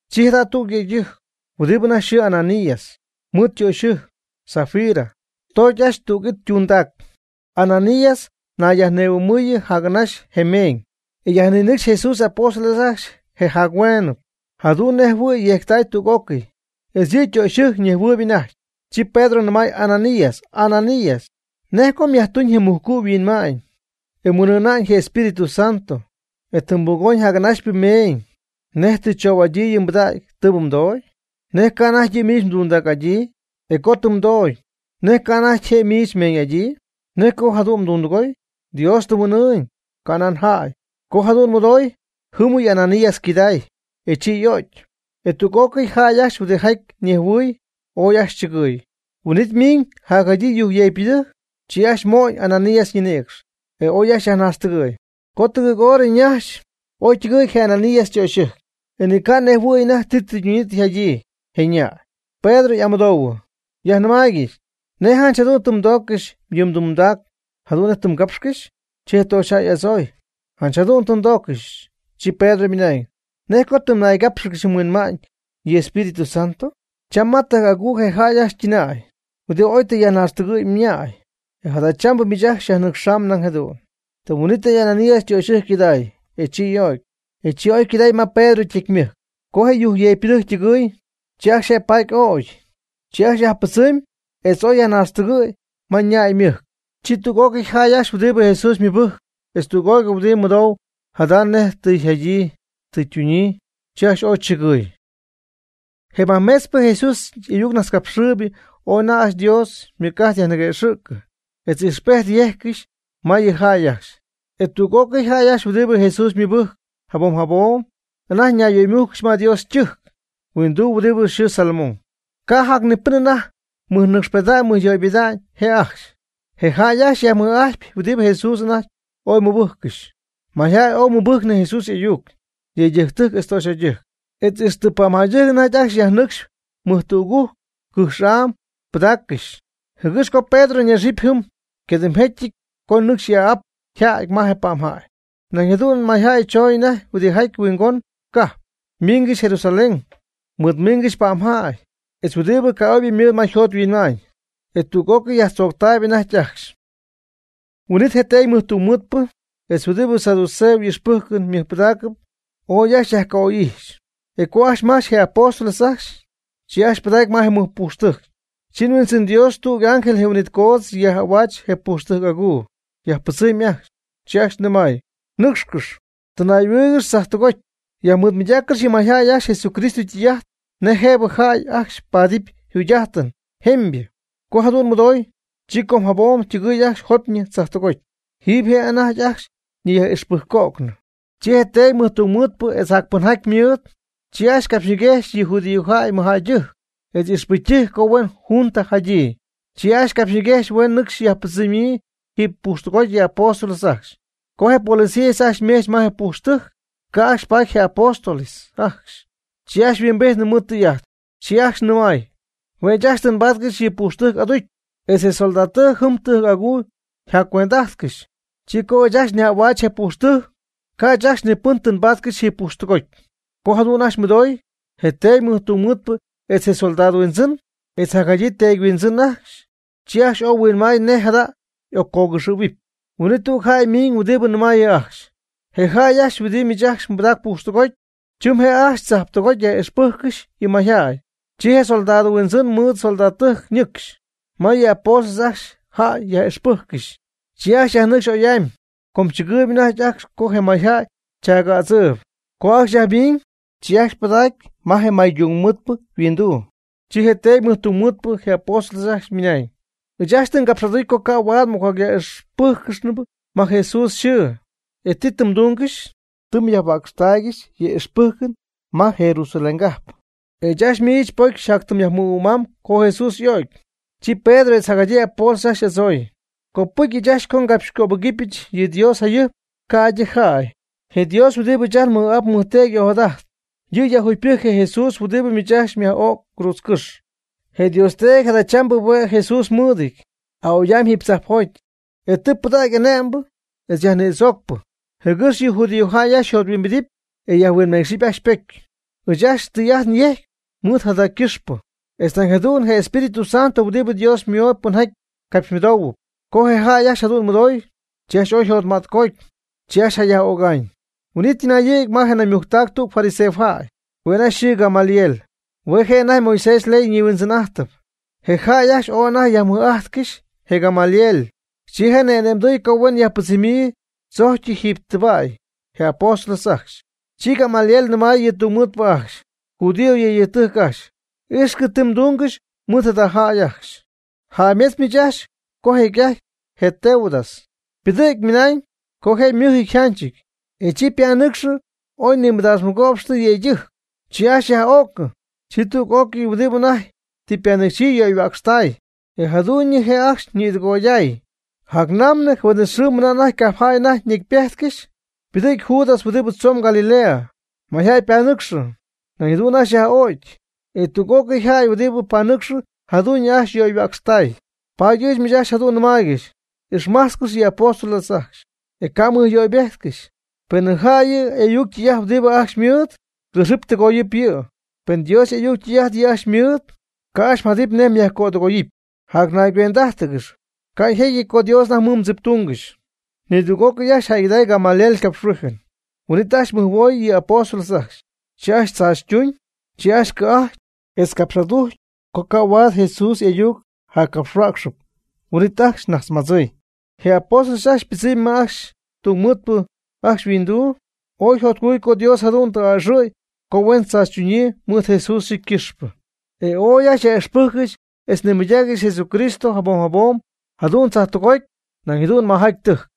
Chi jadüg yëydɨjc, huɨdi anajty yxɨɨ Ananías, mɨɨd ytöxyɨjc, Safira, toogy ajcxy tüg it ytundac. Ananías ñayyajnihuɨ'mɨ jac'anaxy je meeñ, e yajninɨcxy Jesús y'apóstoles ajcxy je jac-hueenɨp, jadu'n nej jɨhuɨ̈y yejctay tüg'ócɨy, etz yɨ' ytöxyɨjc ñejhuɨɨyb anajty. Chi Pedro nɨmay Ananías: ―Ananías, ¿nej co myajtuñ je mujcu' yhuinma'ñ, e mhuin'ɨɨna'ñ je Espíritu Santo, e tɨ mbugoñ jac'anaxypɨ meeñ nej tɨ tzoo'adyii yɨ pɨdägy tɨɨbɨ mdoogy? ¿Nej ca' anajty yɨ' miich mdundac'adyii? E co tɨ mdoogy, ¿nej ca' anajty je' miich mmeeñ'adyii? ¿Nej co jadu'n tɨ mdundɨgooy? Dios tɨ mhuin'ɨɨñ, canan jäy. Co jadu'n mɨdoy, jɨ́mɨyɨ Ananías ycɨday, e chi y'o'cy. E tüg'ócɨy jäy ajcxy huɨdijaty nejhuɨɨy, ooy ajcxy chɨgɨɨy. Huin'it ymiiñ jadyii yujcyeecpɨdɨjc, chi ajcxy mo'ñ Ananías ñinïcx, e oy ajcxy yajnaaxtɨgɨ̈y. Codugɨɨg horɨ naxy, oy ytɨgɨ̈y je Ananías ytöxyɨjc, e ni ca' nejhuɨ̈y anajty ti tɨ ytuñyii tɨ yjadyii je ñäy. Pedro y'amɨdoohuɨ: ―Yajnɨmaaygɨch, ¿nej janch jadu'n tɨ mdooccɨxy yɨ mdundac jadu'n nej tɨ mgapxcɨxy? Chi je töxyjäy y'adzooy: ―Janch jadu'n tɨ ndoogyɨch. Chi Pedro ymɨnañ: ―¿Nej co tɨ mnaygápxɨgɨxy mhuin'ɨɨna'ñ yɨ Espíritu Santo? Cha ma tɨjc'aguu je jäy ajcxy ytɨnäy huɨdi oy tɨ yajnaaxtɨgɨ̈y mñäy, e jadachambɨ miich ajcxy xyajnɨcxaam nañ jadu'n. Tɨm huin'itɨy Ananías ytöxɨjc ycɨday, e chi y'o'cy. E chi oy ycɨdägy ma Pedro ytecymɨjc. Co je yujcyeecpɨdɨjc ytɨgɨɨy, chi ajcxy je' paaty ögy. Chi ajcxy yajpɨdzɨmy etz oy yajnaaxtɨgɨ̈y ma ñäy ymɨjc. Chi tüg'ócɨy je jäy ajcxy huɨdibɨ Jesús mɨbɨjcp etz tüg'ócɨy huɨdibɨ mɨdou jada nej tɨ yjadyii tɨ ytunyii, chi ajcxy ooy chɨgɨ̈y. Je majmetzpɨ Jesús y'ayuccapxhuäcxpɨ ooy anajty ajcxy Dios ymɨc'ajt yajniguëxɨ̈cɨ etz ijxpejt yejccɨxy ma yɨ jäy ajcxy. E tüg'ócɨy jäy ajcxy huɨdibɨ Jesús mɨbɨjc jabom jabom anajty ñayyöymújcɨgɨxy ma Dios ytɨjc huinduu huɨdibɨ yxɨɨ Salomón. Ca' jac ni pɨn anajty mɨjnɨcxpeda'ñ mɨjyöypeda'ñ je' ajcxy. E je jäy ajcxy yjacyajmɨj'ajtpy huɨdi Jesús anajty ooy mɨbɨjccɨxyp. Mayjäy oy mɨbɨjcnɨ Jesús y'ayuc, yëydɨjctɨjc etz töxyjäydɨjc. Etz ixtɨ pa'mjäydɨjc anajty ajcxy yajnɨcxy mɨjtügujc cɨjx'aam pɨdaaccɨxy, jɨgɨx co Pedro ñaxɨpy jɨm ycadɨmjecyɨty co nɨcxy y'aa'ap yjäty ma je pa'mjäy. Nañ jadu'n mayjäy chooñ anajty huɨdijaty huingon ycajp, ymiingɨxy Jerusalén, mɨɨdmiingɨxy pa'mjäy, etz huɨdibɨ ca'oybɨ mɨɨd ma yjot yhuinma'ñ, e tüg'ócɨy yajtzooctaayb anajty ajcxy. Huin'it je teedy mɨjtungmɨɨdpɨ etz huɨdibɨ saduceo ijxpɨ́jcɨn ymɨjpɨdacp ooy ajcxy yajca'oy'ijxy, e co ajcxy majch je apóstoles ajcxy, chi ajcxy pɨdacy ma je mɨjpujxtɨjc. Chi Huindzɨn Dios tüg y'ángel je huin'it coodz yaj'ahuaach je pujxtɨjc aguu, yajpɨdzɨmy ajcxy, chi ajcxy nɨmay: ―Nɨ́cxcɨx, tɨnay'ahuɨɨygɨx tzajtɨgoty, yajmɨɨdmɨydaaccɨx yɨ mayjäy ajcxy Jesucristo ytɨy'ajt nej jëbɨ jäy ajcxy paadɨpy jugy'ájtɨn jemybɨ. Co jadu'n mɨdoy, chi com jabom ytɨgɨɨy ajcxy jopyñɨ tzajtɨgoty. Jiiby je' ajcxy anajty ñiyaj'ixpɨjcco'nɨ. Chi je teedy mɨjtungmɨɨdpɨ etz jacpɨnjaty mɨɨd, chi ajcxy capxyñiguejxy yɨ judíojäy ymɨjjäydɨjc etz ixpɨcytɨjc co huen junta jadyii. Chi ajcxy capxyñiguejxy huen nɨcxy yajpɨdzɨmyii jiiby pujxtɨgoty yɨ apóstoles ajcxy. Co je policías ajcxy ymejch ma je pujxtɨjc, ca' ajcxy paady je apóstoles ajcxy. Chi ajcxy huimbijtnɨ mɨɨd tɨy'ajt, chi ajcxy nɨmay: ―Hue' ɨɨch ajcxy tɨ nbaadcɨxy yɨ pujxtɨjc aducy, etz je soldadtɨjc jɨm tɨjc aguuy yjaccuend'ajtcɨxy. Chi co ɨɨch ajcxy nyaj'ahuäch je pujxtɨjc, ca' ɨɨch ajcxy ni pɨn tɨ nbaatyɨch jiiby pujxtɨgoty. Co jadu'n ajcxy mɨdoy, je teedy mɨjtungmɨɨdpɨ etz je soldado huindzɨn, etz jacjadyii teedy huindzɨn ajcxy, chi ajcxy ooy huinmay nej jada y'occogɨxɨ̈huɨp. Huin'it tüg jäy miiñ huɨdibɨ nɨmaayɨ ajcxy: ―Je jäy huɨdibɨ miich ajcxy mbɨdac pujxtɨgoty, chɨm je' ajcxy tzajtɨgoty yaj'ixpɨjccɨxy yɨ mayjäy. Chi je soldado huindzɨn mɨɨd soldadtɨjc ñɨcxy ma yɨ apóstoles ajcxy jäy yaj'ixpɨjccɨxy, chi ajcxy yajnɨcxy oy'amy, com tzɨgɨɨyb anajty ajcxy co je mayjäy chaagädzɨɨyb. Co ajcxy yajmiiñ, chi ajcxy pɨdacy ma je maytungmɨɨdpɨ yhuinduu. Chi je teedy mɨjtungmɨɨdpɨ je apóstoles ajcxy nɨmay: ―Ɨɨch ajcxy tɨ ngapx'aducy co ca' huaad m'ocjacyaj'ixpɨ́jccɨxnɨ ma Jesús yxɨɨ. E ¿ti tɨ mdungɨxy? Tɨ myajhuäcxtaaygɨxy yɨ m'ixpɨ́jcɨn ma Jerusaléngajp, e ɨɨch ajcxy miich pocy xyjátyɨm yajmɨhuɨ'mam co Jesús y'o'cy. Chi Pedro etz jacjadyii apóstoles ajcxy y'adzooy: ―Copɨcy ɨɨch ajcxy ngapxycöbɨgɨpyɨch yɨ Dios jayɨjp ca'ydɨ jäy. Je Dios huɨdibɨ ɨɨch ajt nmɨj'ap nmɨjteedy y'ojadajt, yɨ' yajjugypɨjc je Jesús huɨdibɨ miich ajcxy myaj'öc cruudzcɨ́xy. Je Dios Teedy jadachambɨ hue' Jesús mɨɨdɨty aa'oy'amy jiiby tzajpjoty, e tɨ pɨdägy ane'mbɨ etz yajnïdzoocpɨ jɨgɨx yɨ judío jäy ajcxy yjothuimbidɨpy e yajhuinmeecxɨpy ajcxy ypocy. Ɨɨch ajcxy tɨy'ajt nyejcpy mɨɨd jada ycɨxpɨ, etz nañ jadu'n je Espíritu Santo huɨdibɨ Dios ymooyb pɨnjaty capxymɨdoohuɨp. Co je jäy ajcxy jadu'n mɨdoy, chi ajcxy ooy yjotmätcoty, chi ajcxy jayaj'öga'ñ. Huin'it ytɨnayɨ̈gy ma je naymujctac tüg fariseojäy, hue' anajty yxɨɨ Gamaliel, hue' je' anajty Moisés yley ñihuindzɨn'ájtɨp. E jäy ajcxy ooy anajty yajmɨj'ajtcɨxy je Gamaliel. Chi je' ni'ane'mdɨɨy co huen yajpɨdzɨmyii tzojcyɨ jiiby tɨba'y je apóstoles ajcxy. Chi Gamaliel nɨmay yɨ tungmɨɨdpɨ ajcxy: ―Judío yëydɨjctɨjc ajcxy, íxcɨm ti mdungɨxy mɨɨd jada jäy ajcxy. Jäymetz miich ajcxy co jecy'ajty je Teudas ypɨdɨ̈gy ymɨnañ co je' ymɨjɨty yjanchɨty, e chi ypanɨcxɨ oy nimɨdaax mɨgo'pxtɨ yëydɨjc. Chi ajcxy yaj'o'cɨ, chi tüg'ócɨy huɨdibɨ anajty tɨ ypanɨcxyii yöyhuäcxtay, e jadu'ñyɨ je' ajcxy ñitɨgoyday. Jacnamnɨ je huin'it xɨɨ mɨna cajpjäy anajty ñecypejtcɨxy, ypɨdɨ̈gy Judas huɨdibɨ tzon Galilea. Mayjäy ypanɨcxɨ; nañ jadu'n ajcxy yaj'o'cy, e tüg'ócɨy jäy huɨdibɨ panɨcxy jadu'ñyɨ ajcxy yöyhuäcxtay. Paady ɨɨch miich ajcxy jadu'n nɨmaaygɨxy, ixmajtzcɨx yɨ apóstoles ajcxy, e ca' mmɨjyöybejtcɨxy. Penɨ jäy yɨ y'ayuc ytɨy'ajt huɨdibɨ ajcxy ymɨɨd, cɨxɨp tɨgoyɨp yɨ'. Pen Dios y'ayuc ytɨy'ajt yɨ' ajcxy ymɨɨd, ca' ajcxy mjadɨpy nej myajcödɨgóoygɨxyɨpy. Jaty nayguend'ájtɨgɨxy, ca' jecyɨty co Dios anajty mɨɨd mdziptungɨxy. Nidüg'ócɨy ajcxy jäygɨdacy Gamaliel ycapxhuíjɨn. Huin'it ajcxy mɨjhuoy yɨ apóstoles ajcxy. Chi ajcxy tzaachytuñ, chi ajcxy cɨ̈'ajty, etz capx'adujcy co ca' huaad Jesús y'ayuc jaccapxhuäcxɨp. Huin'it ajcxy najtzmadzɨɨy. Je apóstoles ajcxy ypɨdzɨmy ajcxy ma tungmɨɨdpɨ ajcxy yhuinduu ooy yjotcujcɨty co Dios jadu'n tɨ aa'ɨxɨ̈y co huen tzaachytuñyii mɨɨd Jesús yxɨɨ ycɨxpɨ. E ooy ajcxy yaj'íxpɨjccɨxy etz nimɨydaaccɨxy Jesucristo jabom jabom jadu'n tzajtɨgoty nañ jadu'n majaty tɨjc.